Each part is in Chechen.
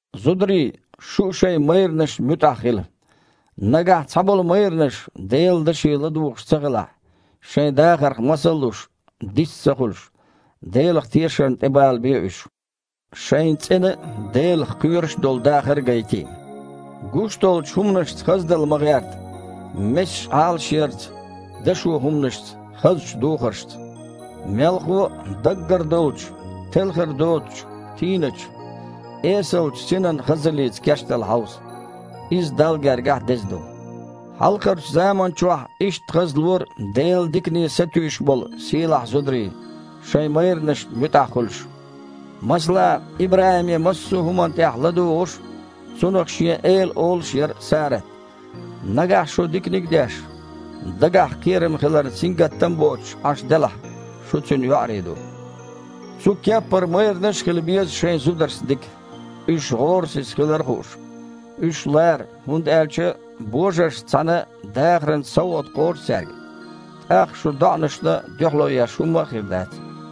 Зударий, шу а шайн майранашна муьтІахь хила. Нагахь цхьаболу майранаш Делан Даше ладугІуш ца хилахь, шайн дахарх масал а луш, дист а ца хуьлуш, Делах тешарна тІебалабе уьш, шайн цІена а, Делах кхоьруш а долу дахар а гайтий. Гуш долчу хІуманашца хаздала ма гІерта: месаш Іалашъярца, дашо хІуманашца, хазачу духаршца. Мелхо а, даггара долчу, телхар доцучу, тийначу, эсалчу синан хазаллица кечдала хьовса. Иза Далла гергахь деза ду. Хьалхарчу заманчохь иштта хазлора Делан дикане сатуьйсуш болу сийлахь зударий, шайн майранашна муьтІахь хуьлуш. Масала, ИбрахІиме массо а хІуманна тІехь ладугІуш а, цунах шен эла олуш а яра Сарат. Нагахь шу диканиг а деш, дагахь кхерам хиларна сингаттам а боцуш Іаш делахь, шу Цуьнан йоІарий ду. Цу кеппара майранаш а хила беза шайн зударшца дика, уьш гІорасиза хилар а хууш. Уьш лара хІунда аьлча божаршца цхьаьна дахаран совгІат кхочу цаьрга. ТІаккха шун доІанашна дуьхьало еш хІумма а хир дац.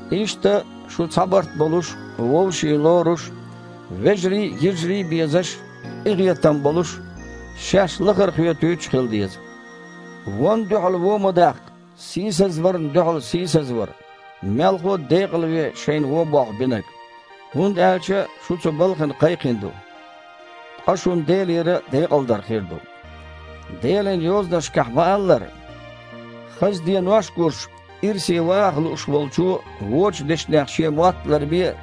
Иштта, шу цхьа барт болуш, вовшийн лоруш а, вежарий а, йижарий а безаш а, къинхетам болуш а, шаьш лахара хоьтуьйтуш а хила деза. Вонна дуьхьал вон ма даккха, сийсазварна дуьхьал сийсазвар, мелхо а декъалве шайна вон болх бинарг. ХІунда аьлча шу цу балхана кхайкхина ду, ткъа шуна Делера декъалдар хир ду. Делан Йозанашкахь ма-аллара: «Хаза денош а гуш, ирсе ваха лууш волчо вочу дешнех шен мотт а ларбе,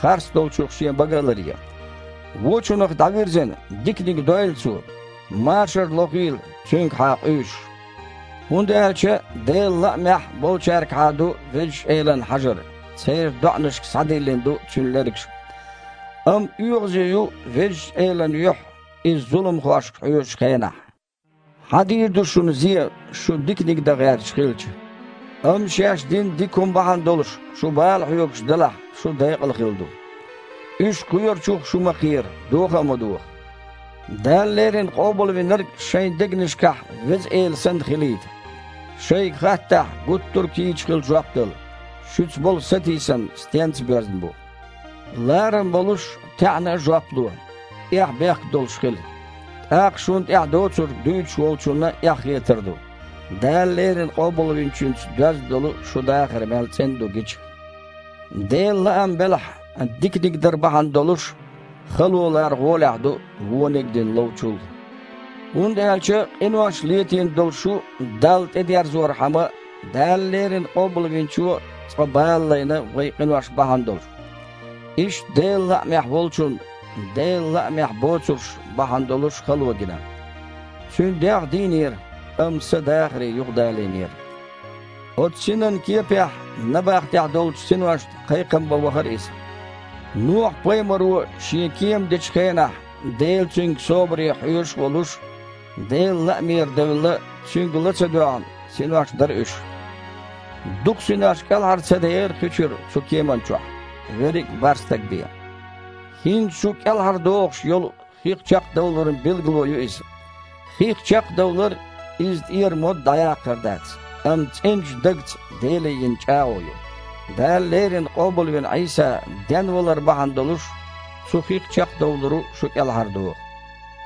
харц долчух шен бага а ларъе. Вочунах дІавирзина, диканиг дойла цо, машар лохийла, цуьнгахьа къуьйсуш. ХІунда аьлча Делан лаамехь болчаьргахьа ду Везачу Элан хьажар, церан доІанашка схьадиллина ду Цуьнан лергаш. Амма оьгІазе ю Везачу Элан юьхь иза зуламхошка хьожучу хенахь». Хьан дийр ду шуна зен, шу диканиг дан гІерташ хилча? Амма шаьш дина дика хІума бахьана долуш шу бала хьоьгуш делахь, шу декъалхилла ду. «Уьш кхоьручух шу ма кхера, доха а ма доха!» Дала леррина Къобалвинарг шайн дегнашкахь Веза Эла санна хилийта. Шайга хаттахь, гуттар а кийча хила жоп дала, шуьца болу сатийсам стенца боьзна бу. Ларам болуш а, таьІна а жоп ло. Эхь-бехк долуш хила, тІаккха шуна тІехь доцург дуьйцуш волчунна эхь хетар ду, Дала леррина Къобалвинчуьнца доьзна долу шун дахар мел цІена ду гича. Делан лаам белахь, диканиг дар бахьана долуш хало лар гІолехь ду, вониг а дина ловчул! ХІунда аьлча къинош летийна долу шу Далла тІе дерзорхьама, Дала леррина Къобалвинчо а цкъа бала лайна вайн къинош бахьана долуш, Иштта Делан лаамехь Волчунна Делан лаамехь боцурш бахьана долуш хало гина. Цуьнан дегІ дийнера, амма Са дахаре юха далийнера. Оцу Синан кепехь набахтехь долчу синошна кхайкхам бан вахара Иза. Нохьа-пайхамаро шен кема дечу хенахь, Дела цуьнга собаре хьоьжуш а волуш, Делан лаамера девлла, Цуьнга ла ца доьгІна синош дара уьш. Дукха синош кІелхьара ца дехира хи чуьра цу кемана чохь, верриг а бархІ стаг бен. ХІинца шу кІелхьардохуш йолу хих чекхдовларан билгало ю иза. Хих чекхдовлар – иза тІера мода дІаяккхар дац, амма цІеначу дагца Деле йина чІагІо ю. Дала леррина къобалвина Іийса денвалар бахьана долуш цу хих чекхдовларо шу кІелхьардоху.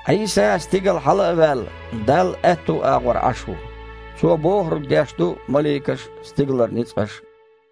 Іийса, стигала хьала а ваьлла, Далла аьтту агІор Іаш ву. Цо бохург деш ду маликаш а, стигалара ницкъаш а.